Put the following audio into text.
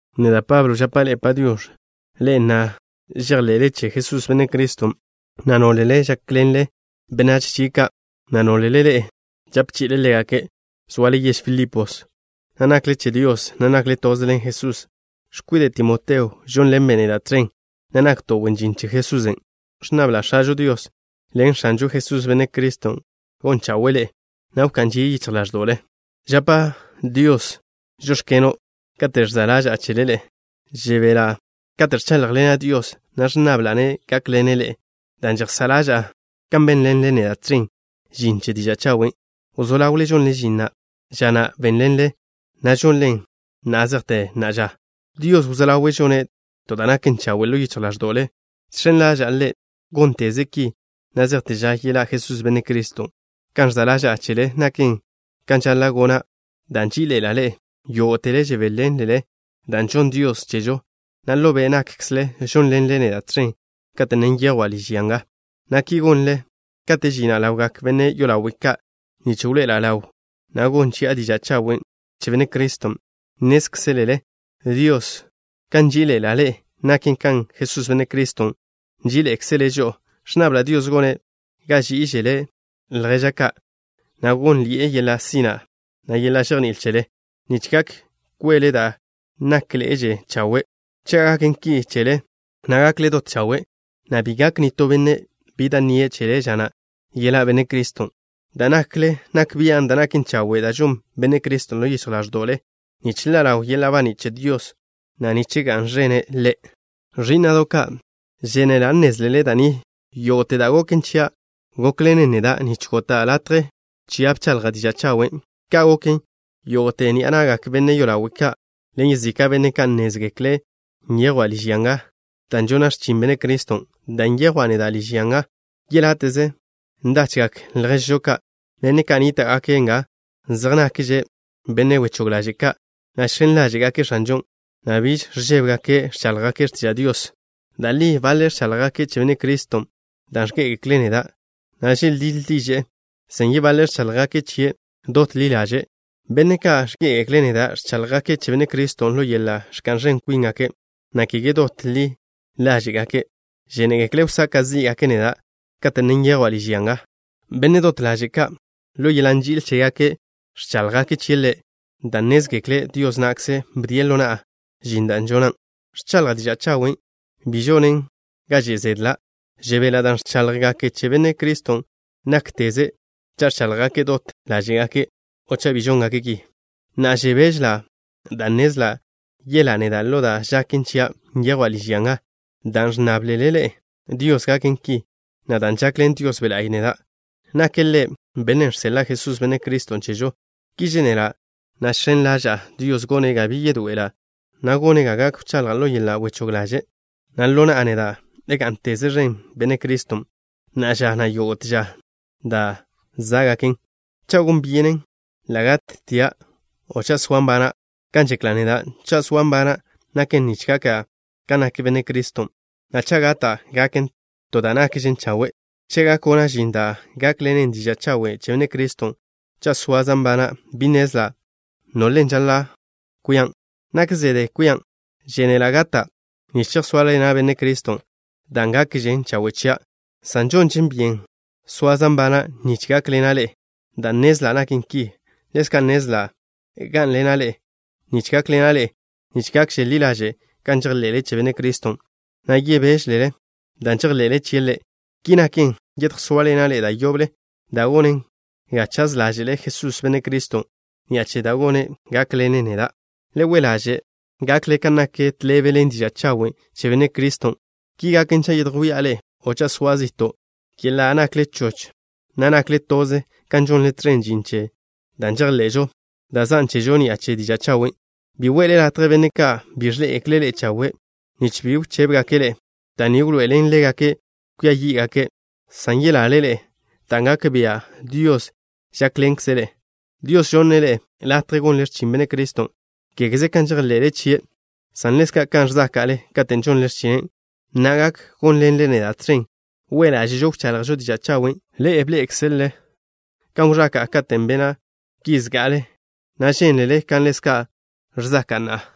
Neda', Pablo, žapa' ḻe'e “Padiox̱”, ḻe'e na' žejḻe'le che Jesús, Benne' Criston', na' nólele žákḻenle benách chie' ka', na' nólele ḻe'e žape chi'ile ḻégake'. Zoale yež Filipos, na' nakle che Dios, na' nakle toze ḻen Jesusen'. X̱kwide' Timoteo žónḻenbe' neda' tẕen, na' nakto' wen žin che Jesusen'. Ẕnnabla' X̱ažo Dios ḻen X̱anžo Jesús, Benne' Criston', gon chawe'e ḻe'e, na' wká'n žie' yichj ḻáẕdo'le. Žapa' Dios: “Žóx̱keno'” kate' ẕza' ḻaža'a chele ḻe'e. Žebela' kate' ẕcháḻjḻena' Dios, na' ẕnnabla'-ne' gákḻene' ḻe'e dan' žejsá' ḻaža'a kan bénḻenle neda' tẕen žin che diža' chawen'. Wzó ḻawle žonle žin na' ža na' bénlelen, na' žonlen na' zejte na'a ža. Dios wzó ḻawe' žone' to da' naken chawe' ḻo yichj ḻáẕdo'le. Žx̱en ḻaža'a Ḻe' gónteze' ki na' zejte ža yeḻá' Jesús, Benne' Criston'. Kan ẕza' ḻaža'a chele naken kan žaḻa' gona' dan' nží'iḻe'ela' ḻe'e. Yógo'tele žebéḻenlele da' žonn Dios chežo, na' ḻo be' nakkzle žónḻenle neda' tẕen kate' ne nyejwa' liž ya nga, na' ki gonle kate' žina' ḻawgak benne' yolawe' ka' nich wḻoe'ela' ḻaw, na' gon chi'a diža' chawen' che Benne' Criston'. Nnézkzele Dios kan nží'iḻe'ela' ḻe'e. Naken kan Jesús, Benne' Criston', nží'iḻe'ekzele' žo'o. Ẕnnabla' Dios gone' ga ží'iželele lježle ka', na' gónnḻi'e yeḻa' sina', na' yeḻa' žejní'il chele, nich gak kwele da' nákḻe'eže chawe'. Cha' gaken ki chele, na' gakle dot chawe', na' bi gak nitó benne' bi da' nnie' chele ža na' yeḻá' Benne' Criston'. Da' nakle nak bian' da' naken chawe' da' žon Benne' Criston' ḻo yichj ḻáẕdo'le nich ḻa' ḻaw yeḻa' baní' che Dios, na' nich ga'n ẕene' Ḻe'. Ẕí'na'do' ka', žénela' nnézlele da' ni: yógo'te da' goken chia' gókḻenen neda' nich gota' latje chia' bchaḻja' diža' chawen'. Ka' goken, yógo'te ni'a na'gak benne' yolawe' ka' ḻen yezika' benne' ka', nnézgekle' nyejwa' liž ya nga dan' žona' x̱chin Benne' Criston'. Dan' nyejwa' neda' liž ya nga, yeláte'ze ndachgak lježžo ka', benne' ka' nníta'gake' nga, zej nakže' benne' wechóg ḻaže' ka', na' žx̱en ḻáže'gake' X̱anžon', na' biž ẕžébegake' ẕcháḻjgake' x̱tiža' Dios. Da' li baḻe' ẕcháḻjgake' che Benne' Criston' dan' ẕgé'egekle' neda', na' želdíḻ diže'e, san yebaḻe' ẕcháḻjgake' chie' dot ḻi ḻáže'gake'. Benne' ka' ẕgé'egekle' neda' ẕcháḻjgake' che Benne' Criston' ḻo yeḻa' ẕka'n ẕen kwíngake', na' kege dot ḻi ḻáže'gake'. Žénegekle' wsaka' zí'gake' neda' kate' ne nyejwa' liž ya nga. Benne' dot ḻaže' ka', ḻo yeḻa' nži'il chégake' ẕcháḻjgake' chie' Ḻe', dan' nnézgekle' Dios na'kze bdie' ḻo na'a žin da' žona', ẕchaḻja' diža' chawen'. Bi žonen ga že' zedla'. Žebela' dan' ẕcháḻjgake' che Benne' Criston' nákteze, cha' ẕcháḻjgake' dot ḻáže'gake' o cha' bi žóngaken' ki. Na'a, žebéžela' dan' nnezla' yelá' neda' ḻo da' žaken chia', nyejwa' liž ya nga, dan' ẕnnáblele ḻe'e Dios gaken ki, na' dan' žakḻen Dios Be' La'y neda'. Nake' Ḻe' Bennen' žseḻa' Jesús, Benne' Criston', chežo. Ki žénela', na' žx̱en ḻaža'a Dios, gone' ga bi yedoe'ela', na' gone' ga gak wchaḻja' ḻo yeḻa' wechóg ḻaže', na' ḻo na'a neda' gá'nteze ẕen Benne' Criston' na'a ža, na' yógo'te ža da' zá'gaken, cha' gon byenen ḻa' gattia' o cha' soa' nbana'. Kan žekla' neda', cha' zoa' nbana', naken nich gaka' kan nak Benne' Criston', na' cha' gata', gaken to da' nakžen chawe'. Cha' gak gona' žin da' gákḻenen diža' chawen' che Benne' Criston' cha' soaza' nbana', bi nnezla' bile žaḻa' kwian'. Nak zede kwian'. Žénela' gata' nich chejsóaḻena' Benne' Criston', da' gakžen chawe' chia', san žonže byenen soaza' nbana' nich gak gákḻena' ḻe'e. Dan' nnezla' naken ki, ḻezka' nnezla' gá'nḻena' ḻe'e nich gákḻena' ḻe'e nich gakže ḻi ḻaže' kan žejḻe'le che Benne' Criston', na' yebéželele dan' žejḻe'le chie' Ḻe'. Ki naken, yedjsóaḻena' ḻe'e da' yoble, da' gonen ga chaz ḻáže'le Jesús, Benne' Criston', ni'a che da' gone', gákḻene' neda'. Le we' ḻáže'ze gakle kan naken tḻebe ḻen diža' chawen' che Benne' Criston'. Ki gaken, cha' yedjwía' ḻe'e o cha' soa' zi'to', yenla' nakle choch, na' nakle toze kan žonle tẕen žin che da' žejḻe'žo, dan' zan' chežo ni'a che diža' chawen'. Bi we'le latje benne' ka' bi ẕḻé'egekle' ḻe'e chawe' nich bi wchébegake' ḻe'e. Da' ni wḻoe'elen ḻégake' kwia yí'gake', san yelale ḻe'e, dan' gak bia' Dios žákḻenkze' ḻe'e. Dios žonne' ḻe'e latje gonle x̱chin Benne' Criston', kégeze kan žejḻe'le chie', san ḻezka' kan ẕzáka'le katen' žonle x̱chinen'. Na'a, gak gónḻenle neda' tẕen we' ḻáže'žo wchaḻjžo diža' chawen'. Bḻé'ekzelele kan wẕaka'a katen' bena' ki zga'ale, na' žénlele kan ḻezka' ẕzaka'a na'a.